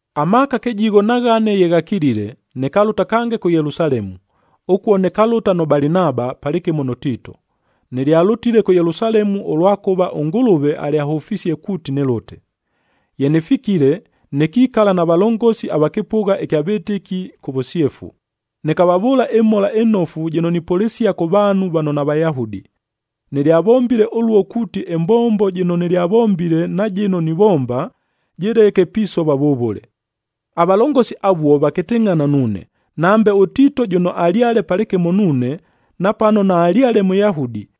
Amaaka kɨjigho na ghane ye ghakilile, nɨkalʉta kange kʉ Yelusalemu. Ʉkuo nɨkalʉta nʉ Balinaba, palɨkɨmo nʉ Tiito. Nɨlyalʉtile kʉ Yelusalemu, ʉlwakʉva ʉNgʉlʉve alyahʉfisie kuuti nɨlʉte. Ye nɨfikile, nɨkikala na valongosi ava kɨpʉgha ɨkya vɨtɨki kʉ vʉsyefu, nɨkavavʉʉla ɨMhola ɨNofu jɨno nipʉlɨsia kʉ vaanhu vano naVayahudi. Nɨlyavombile ʉluo kuuti ɨmbombo jɨno nɨlyavombile na jɨno nivomba, jɨleke pisova vʉvʉle. Avalongosi avuo vakɨtɨngʼhana nuune, nambe ʉTiito jʉno alyale palɨkɨmo nuune, napano naalyale Mʉyahudi,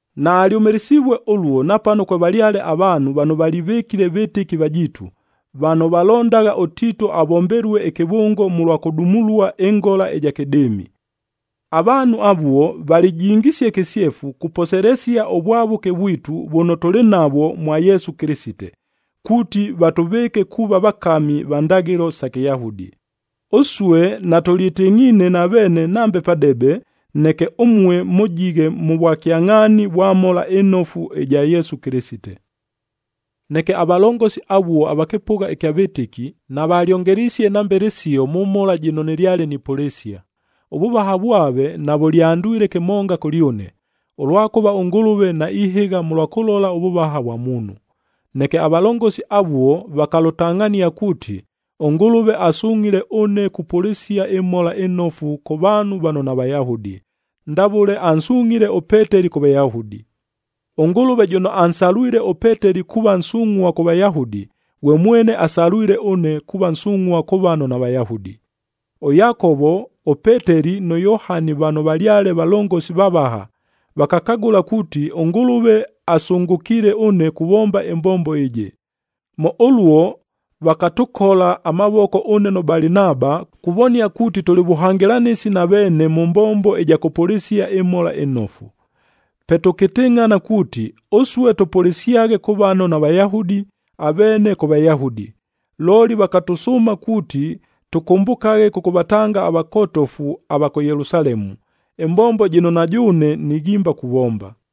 Naalyʉmɨlɨsivue ʉluo napano kwevalyale avaanhu vano valivɨkile vɨtɨki vajiitu, vano valondagha ʉTiito avombelue ɨkɨvʉngo mʉlwa kʉdumulua ɨngola ɨja kɨdɨɨmi. Avaanhu avuo valijingisie kɨsyefu kuposelesia ʉvwavʉke vwitu vʉno tʉlɨ navwo mwa Yesu Kɨlɨsite, kuuti vatʉvɨɨke kuuva vakami va ndaghɨlo sa Kɨyahudi. Ʉsue natʉlyɨtɨngʼhiine na veene nambe padebe, neke ʉmue mʉjighe mʉ vwakyangʼhaani vwa Mhola ɨNofu ɨja Yesu Kɨlɨsite. Neke avalongosi avuo ava kɨpʉgha ɨkya vɨtɨki, navalyongelisie nambe lɨsio mʉ mhola jɨno nɨlyale nipʉlɨsia. Ʉvʉvaha vwave navʉlyandwile kɨmonga kʉlyʉne, ʉlwakʉva ʉNgʉlʉve naihɨgha mʉlwa kʉlola ʉvʉvaha vwa muunhu. Neke avalongosi avuo vakalʉtangʼhania kuuti, ʉNgʉlʉve asungʼhile ʉne kupʉlɨsia ɨMhola ɨNofu kʉ vaanhu vano naVayahudi, ndavʉle ansungʼhile ʉPeteli kʉ Vayahudi. ɄNgʉlʉve jʉno ansalwile ʉPeteli kuuva nsungʼhua kʉ Vayahudi, ghwe mwene asalwile ʉne kuuva nsungʼhua kʉ vano naVayahudi. ɄYakovo, ʉPeteli nʉ Yohani vano valyale valongosi vavaha, vakakagʉla kuuti ʉNgʉlʉve asʉngʉkiile ʉne kuvomba ɨmbombo ɨjɨ. Mʉ ʉluo vakatʉkola amavoko ʉne nʉ Balinaba, kuvonia kuuti tʉlɨ vʉhangɨlanɨsi na veene mʉ mbombo ɨja kʉpʉlɨsia ɨMhola ɨNofu. Pe tʉkɨtɨngʼhana kuuti, ʉsue tʉpʉlɨsyaghe kʉ vano naVayahudi, aveene kʉ Vayahudi. Looli vakatʉsʉʉma kuuti tʉkʉmbʉkaghe kʉkʉvatanga avakotofu ava kʉ Yelusalemu, ɨmbombo jɨno na jʉʉne nighimba kuvomba.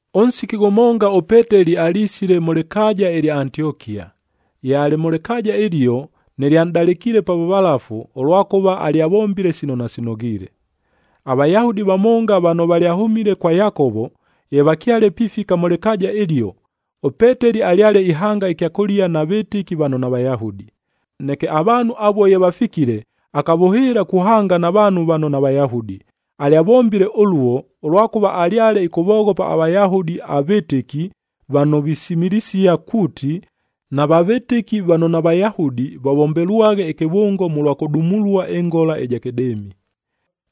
Ʉnsiki ghʉmonga ʉPeteli alisile mʉ lɨkaaja ɨlya Antiokia. Ye alɨ mʉ lɨkaaja ɨlio, nɨlyanʼdalɨkiile pa vʉvalafu, ʉlwakʉva alyavombile sino nasinoghiile. AVayahudi vamonga vano valyahʉmile kwa Yakovo, ye vakyale pifika mʉ lɨkaaja ɨlio, ʉPeteli alyale ihanga ɨkyakʉlia na vɨtɨki vano naVayahudi. Neke avaanhu avuo ye vafikile, akavʉhɨɨla kuhanga na vaanhu vano naVayahudi. Alyavombile ʉluo, ʉlwakʉva alyale ɨkʉvoghopa aVayahudi avɨtɨki vano visimilisia kuuti, nava vɨtɨki vano naVayahudi vavombelwaghe ɨkɨvʉngo mʉlwa kʉdumulua ɨngola ɨja kɨdɨɨmi.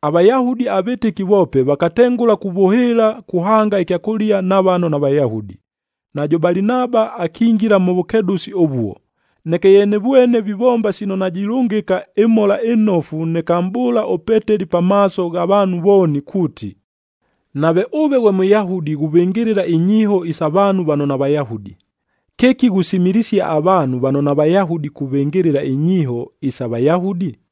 AVayahudi avɨtɨki voope vakatengʉla kuvʉhɨɨla kuhanga ɨkyakʉlia na vano naVayahudi. Najʉ Balinaba akingila mʉ vʉkedʉsi ʉvuo. Neke ye nɨvwene vivomba sino najilʉngɨka ɨMhola ɨNofu, nɨkamʼbʉʉla ʉPeteli pamaaso gha vaanhu vooni kuuti, “Nave ʉve ghwe Mʉyahudi ghuvɨngɨlɨla inyiiho isa vaanhu vano naVayahudi, kɨki ghusimilisia avaanhu vano naVayahudi kuvɨngɨlɨla inyiiho isa Vayahudi?”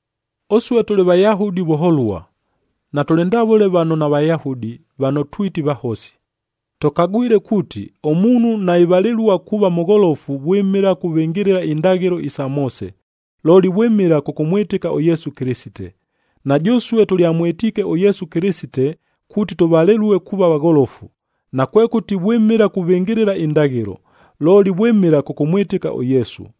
Ʉsue tʉlɨ Vayahudi vʉholua, natʉlɨ ndavʉle vano naVayahudi, vano twiti vahosi. Tʉkagwile kuuti, ʉmuunhu naivalɨlua kuuva mʉgholofu vwɨmɨla kuvɨngɨlɨla indaghɨlo isa Moose, looli vwɨmɨla kʉkʉmwɨtɨka ʉYesu Kɨlɨsite. Na jʉsue tʉlyamwɨtiike ʉYesu Kɨlɨsite kuuti tʉvalɨlue kuuva vagholofu, nakwekʉti vwɨmɨla kuvɨngɨlɨla indaghɨlo, looli vwɨmɨla kʉkʉmwɨtɨka ʉYesu.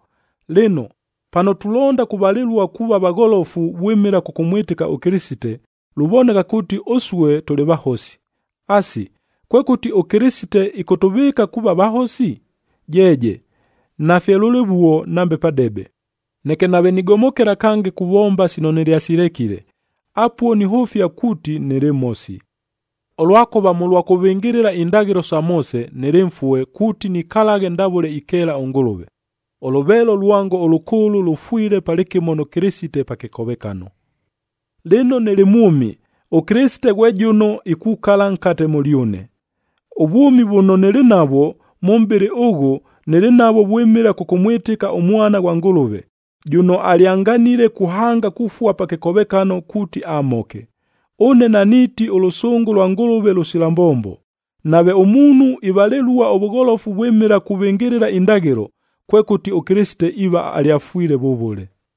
Lɨno, pano tulonda kuvalɨlua kuuva vagholofu vwɨmɨla kʉkʉmwɨtɨka ʉKɨlɨsite, luvoneka kuuti ʉsue tʉlɨ vahosi. Asi, kwekʉti ʉKɨlɨsite ɨkʉtʉvɨɨka kuuva vahosi? Jeeje! Nafye lʉlɨvuo nambe padebe! Neke nave nigomokela kange kuvomba sino nɨlyasilekile, apuo nihʉfia kuuti nɨlɨ mhosi. Ʉlwakʉva mʉlwa kuvɨngɨlɨla indaghɨlo isa Moose, nɨlɨ mfue kuuti nikalaghe ndavʉle ikeela ʉNgʉlʉve. Ʉlʉveelo lwango ʉlʉkʉʉlʉ lʉfwile palɨkɨmo nʉ Kɨlɨsite pa kɨkovekano. Lɨno nɨlɨ mwʉmi, ʉKɨlɨsite ghwe jʉno ikukala nkate mʉlyʉne. Ʉvwʉmi vʉno nɨlɨ navwo mʉ mʼbɨlɨ ʉghʉ, nɨlɨ navwo vwɨmɨla kʉkʉmwɨtɨka ʉMwana ghwa Ngʉlʉve, jʉno alyanganile kuhanga kufua pa kɨkovekano kuuti amhoke. Ʉne naniiti ʉlʉsʉngʉ lwa Ngʉlʉve lʉsila mbombo. Nave ʉmuunhu ivalɨlua ʉvʉgholofu vwɨmɨla kuvɨngɨlɨla indaghɨlo, kwekʉti ʉKɨlɨsite iiva alyafwile vʉvʉle.